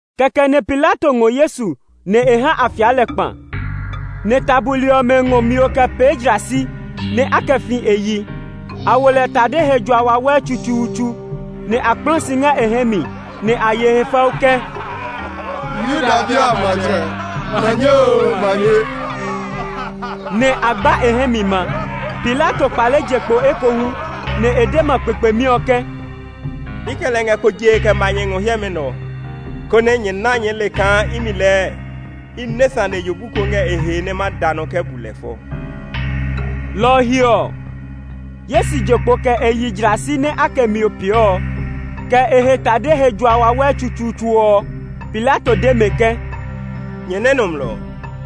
Kɛkɛ nɛ Pilato ngɔ Yesu, nɛ e ha a fia lɛ kpa; nɛ ta buli ɔmɛ ngɔ mio kɛ pee jlasi, nɛ a kɛ fi e yi. A wo lɛ tade he jua wawɛ tsutsuutsu; nɛ a kplã si ngɛ e hɛ mi, nɛ a ye e he fɛu ke, “Yuda bi a matsɛ, manye oo manye!” Nɛ a gba e hɛ mi ma. Pilato kpale je kpo ekohu, nɛ e de ma kpekpemi ɔ ke, “I kɛ lɛ ngɛ kpo jee kɛ ma nyɛ ngɔ hiɛmɛ nɛ ɔ, konɛ nyɛ na nyɛɛ le kaa imi lɛɛ i nɛ sane yobu ko ngɛ e he nɛ ma da nɔ kɛ bu lɛ fɔ.” Lɔ ɔ he ɔ, Yesu je kpo kɛ e yi jlasi nɛ a kɛ mio pee ɔ, kɛ e he tade he jua wawɛ tsutsuutsu ɔ. Pilato de mɛ ke, “Nyɛ nɛ nɔmlɔ ɔ!”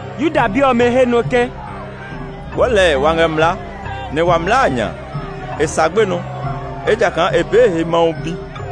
Yuda bi ɔmɛ he nɔ ke, “Wɔɔ lɛɛ wa ngɛ mlaa, nɛ wa mlaa a nya a, e sa gbenɔ, ejakaa e pee e he Mawu Bi.”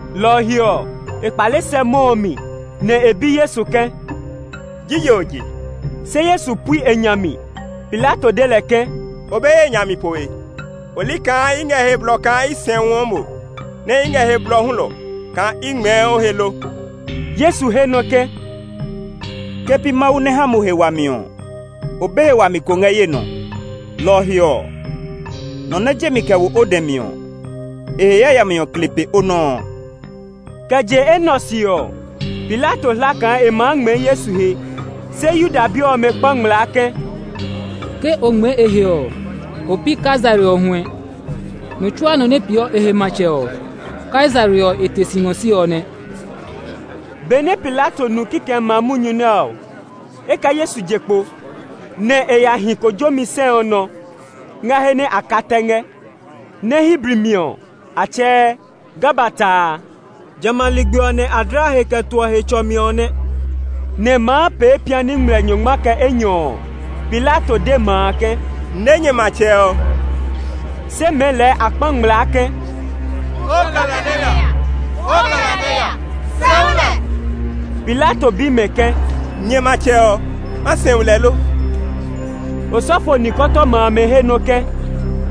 Lɔ ɔ he ɔ, e kpale sɛ mɔ ɔ mi, nɛ e bi Yesu ke, “Jije o je?” Se Yesu pui e nya mi. Pilato de lɛ ke, “O be ye nya mi poe? O li kaa i ngɛ he blɔ kaa i sɛuɔ mo, nɛ i ngɛ he blɔ hulɔ kaa i ngmɛɛ o he lo?” Yesu he nɔ ke, “Ke pi Mawu nɛ ha mo he wami ɔ, o be he wami ko ngɛ ye nɔ. Lɔ ɔ he ɔ, nɔ nɛ je mi kɛ wo o dɛ mi ɔ, e he yayami ɔ kle pe o nɔ́ ɔ.” Kɛ je enɛ ɔ se ɔ, Pilato hla kaa e maa ngmɛɛ Yesu he. Se Yuda bi ɔmɛ kpa ngmlaa ke, “Ke o ngmɛɛ e he ɔ, o pi Kaisare ɔ huɛ. Nɔ tsuaa nɔ nɛ peeɔ e he matsɛ ɔ, Kaisare ɔ e te si ngɔ si ɔ nɛ.” Benɛ Pilato nu kikɛmɛ a munyu nɛ ɔ, e kɛ Yesu je kpo, nɛ e ya hi kojomi sɛ ɔ nɔ ngɛ he nɛ a ka tɛ ngɛ, nɛ Hebri mi ɔ, a tsɛɛ “Gabata” a. Jamɛ a ligbi ɔ nɛ a dlaa he kɛ toɔ Hetsɔmi ɔ nɛ; nɛ maa pee piani ngmlɛ nyɔngma kɛ enyɔ ɔ, Pilato de ma a ke, “Ne nyɛ matsɛ ɔ!” Se mɛɛ lɛɛ a kpa ngmlaa ke, “O kɛ lɛ nɛ ya! O kɛ lɛ nɛ ya! Sɛu lɛ!” Pilato bi mɛ ke, “Nyɛ matsɛ ɔ, ma sɛu lɛ lo?” Osɔfo nikɔtɔma amɛ he nɔ ke,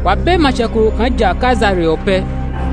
“Wa be matsɛ ko kaa ja Kaisare ɔ pɛ.”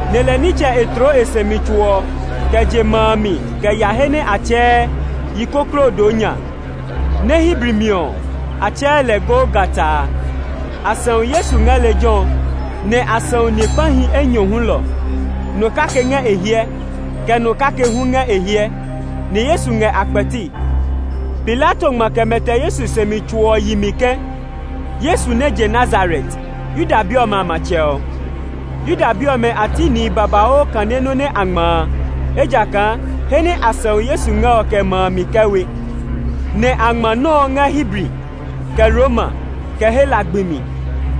nɛ lɛ nitsɛ e tloo e sɛumi tso ɔ kɛ je ma a mi kɛ ya he nɛ a tsɛɛ “Yikoklodonya”, nɛ Hebri mi ɔ a tsɛɛ lɛ “Golgata” a. A sɛu Yesu ngɛ lejɛ ɔ, nɛ a sɛu ni kpahi enyɔ hulɔ; nɔ kake ngɛ e hiɛ, kɛ nɔ kake hu ngɛ e hiɛ; nɛ Yesu ngɛ a kpɛti. Pilato ngma kɛ mɛtɛ Yesu sɛumi tso ɔ yi mi ke, “Yesu nɛ je Nazaret, Yuda bi ɔmɛ a matsɛ ɔ.” Yuda bi ɔmɛ a ti nihi babauu kane nɔ nɛ a ngma a, ejakaa he nɛ a sɛu Yesu ngɛ ɔ kɛ ma a mi kɛ we; nɛ a ngma nɔ́ ɔ ngɛ Hebri, kɛ Roma, kɛ Hela gbi mi.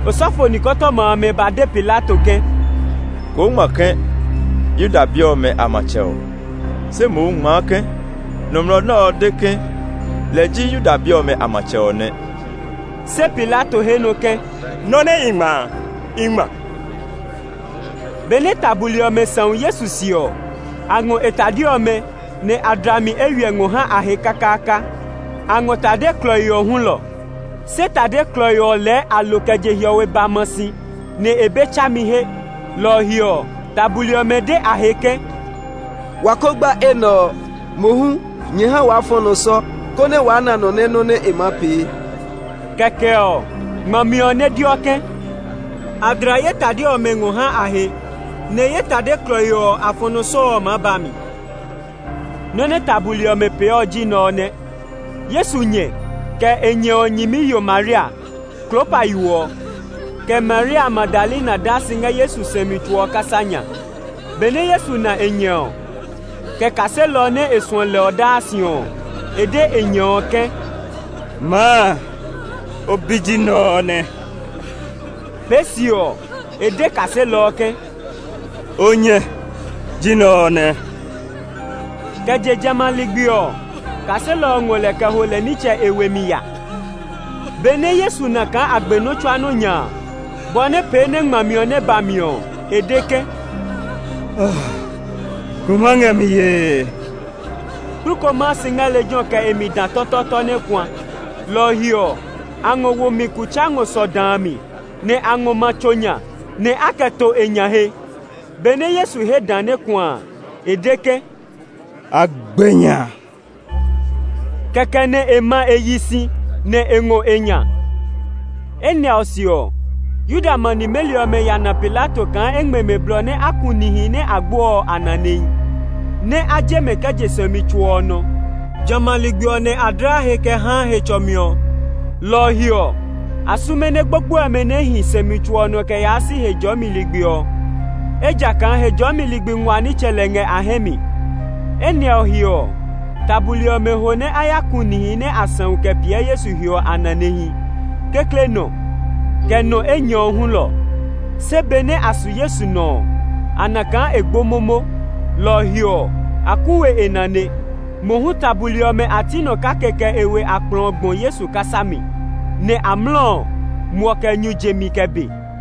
Osɔfo nikɔtɔma amɛ ba de Pilato ke, “Koo ngma ke, ‘Yuda bi ɔmɛ a matsɛ ɔ.’ Se mohu ngmaa ke, ‘Nɔmlɔ nɛ ɔ de ke lɛ ji Yuda bi ɔmɛ a matsɛ ɔ nɛ.’” Se Pilato he nɔ ke, “Nɔ nɛ i ngma a, i ngma.” Benɛ ta buli ɔmɛ sɛu Yesu se ɔ, a ngɔ e tade ɔmɛ, nɛ a dla mi eywiɛ ngɔ ha a he kakaaka. A ngɔ tade klɔii ɔ hulɔ; se tade klɔii ɔ lɛɛ a lo kɛ je hiɔwe ba ma si, nɛ e be tsami he. Lɔ ɔ he ɔ, ta buli ɔmɛ de a he ke, “Wa ko gba enɛ ɔ; mohu nyɛ ha waa fɔ̃ nɔ sɔ, konɛ waa na nɔ nɛ nɔ́ nɛ e maa pee.” Kɛkɛ ɔ, ngmami ɔ nɛ deɔ ke, “A dla ye tade ɔmɛ ngɔ ha a he; nɛ ye tade klɔii ɔ, a fɔ̃ nɔ sɔ” ɔ maa ba mi. Nɔ́ nɛ ta buli ɔmɛ pee ɔ ji nɛ ɔ nɛ. Yesu nyɛ, kɛ e nyɛ ɔ nyɛmiyo Maria, Klopa yo ɔ, kɛ Maria Magdalena daa si ngɛ Yesu sɛumi tso ɔ kasa nya. Benɛ Yesu na e nyɛ ɔ, kɛ kaselɔ ɔ nɛ e suɔ lɛ ɔ daa si ɔ, e de e nyɛ ɔ ke, “Maa, o bi ji nɛ ɔ nɛ!” Pee se ɔ, e de kaselɔ ɔ ke, “O nyɛ ji nɛ ɔ nɛ!” Kɛ je jamɛ a ligbi ɔ, kaselɔ ɔ ngɔ lɛ kɛ ho lɛ nitsɛ e we mi ya. Benɛ Yesu na kaa a gbe nɔ́ tsuaa nɔ́ nya a, bɔ nɛ pee nɛ ngmami ɔ nɛ ba mi ɔ, e de ke, “Kuma ngɛ mi yee!” Kplu ko maa si ngɛ lejɛ ɔ kɛ e mi dã tɔtɔɔtɔ nɛ kuã. Lɔ ɔ he ɔ, a ngɔ wo mi kutsa ngɔ sɔ dã a mi, nɛ a ngɔ ma tso nya, nɛ a kɛ to e nya he. Benɛ Yesu he dã nɛ kuã a, e de ke, “A gbe nya!” Kɛkɛ nɛ e ma e yi si, nɛ e ngɔ e nya. Enɛ ɔ se ɔ, Yuda ma nimeli ɔmɛ ya na Pilato kaa e ngmɛ mɛ blɔ nɛ a ku nihi nɛ a gbe ɔ a nanehi, nɛ a je mɛ kɛ je sɛumi tso ɔ nɔ. Jamɛ a ligbi ɔ nɛ a dlaa he kɛ haa Hetsɔmi ɔ, lɔ ɔ he ɔ, a sume nɛ gbogboe ɔmɛ nɛ a hi sɛumi tso nɔ kɛ yaa si Hejɔɔmi ligbi ɔ, ejakaa Hejɔɔmi ligbi nguaa nitsɛ lɛ ngɛ a hɛ mi. Enɛ ɔ he ɔ, ta buli ɔmɛ ho nɛ a ya ku nihi nɛ a sɛu kɛ piɛ Yesu he ɔ a nanehi, kekle nɔ ɔ, kɛ nɔ enyɔne ɔ hulɔ. Se benɛ a su Yesu nɔ ɔ, a na kaa e gbo momo, lɔ ɔ he ɔ, a ku we e nane. Mohu ta buli ɔmɛ a ti nɔ kake kɛ e we akplɔ ɔ gbɔ Yesu kasa mi; nɛ amlɔ ɔ, muɔ kɛ nyu je mi kɛ be.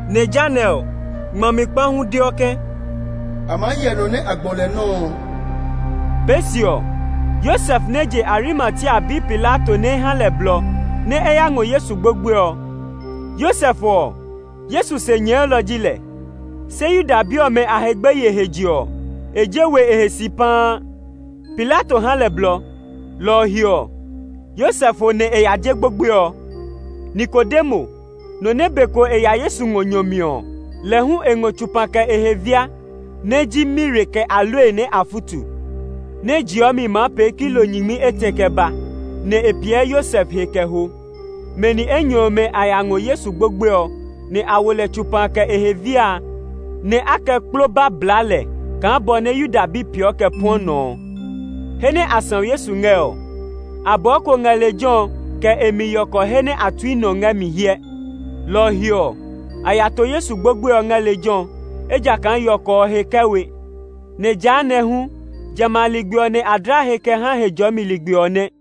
Nɛ jehanɛ ɔ, ngmami kpa hu deɔ ke, “A maa hyɛ nɔ nɛ a gbɔ lɛ nɔ́ ɔ.” Pee se ɔ, Yosef nɛ je Arimatia ya bi Pilato nɛ́ e ha lɛ blɔ, nɛ e ya ngɔ Yesu gbogboe ɔ. Yosef ɔ, Yesu se nyɛɛlɔ ji lɛ, se Yuda bi ɔmɛ a he gbeye he je ɔ, e je we e he si paa. Pilato ha lɛ blɔ; lɔ ɔ he ɔ, Yosef ho nɛ e ya je gbogboe ɔ. Nikodemo, nɔ nɛ be ko e ya Yesu ngɔ nyɔ mi ɔ, lɛ hu e ngɔ tsopa kɛ e he via, nɛ ji mire kɛ aloe nɛ a futu, nɛ jiimi maa pee kilo nyingmi etɛ kɛ ba, nɛ e piɛ Yosef he kɛ ho. Mɛ ni enyɔ ɔmɛ a ya ngɔ Yesu gbogboe ɔ, nɛ a wo lɛ tsopa kɛ e he via a, nɛ a kɛ kploba bla lɛ kaa bɔ nɛ Yuda bi peeɔ kɛ puɔ nɔ ɔ. He nɛ a sɛu Yesu ngɛ ɔ, abɔɔ ko ngɛ lejɛ ɔ kɛ e mi yɔkɔ he nɛ a to we nɔ ngɛ mi hyɛ. Lɔ ɔ he ɔ, a ya to Yesu gbogboe ɔ ngɛ lejɛ ɔ, ejakaa yɔkɔ ɔ he kɛ we, nɛ jehanɛ ɔ hu, jamɛ a ligbi ɔ nɛ a dlaa he kɛ haa Hejɔɔmi ligbi ɔ nɛ.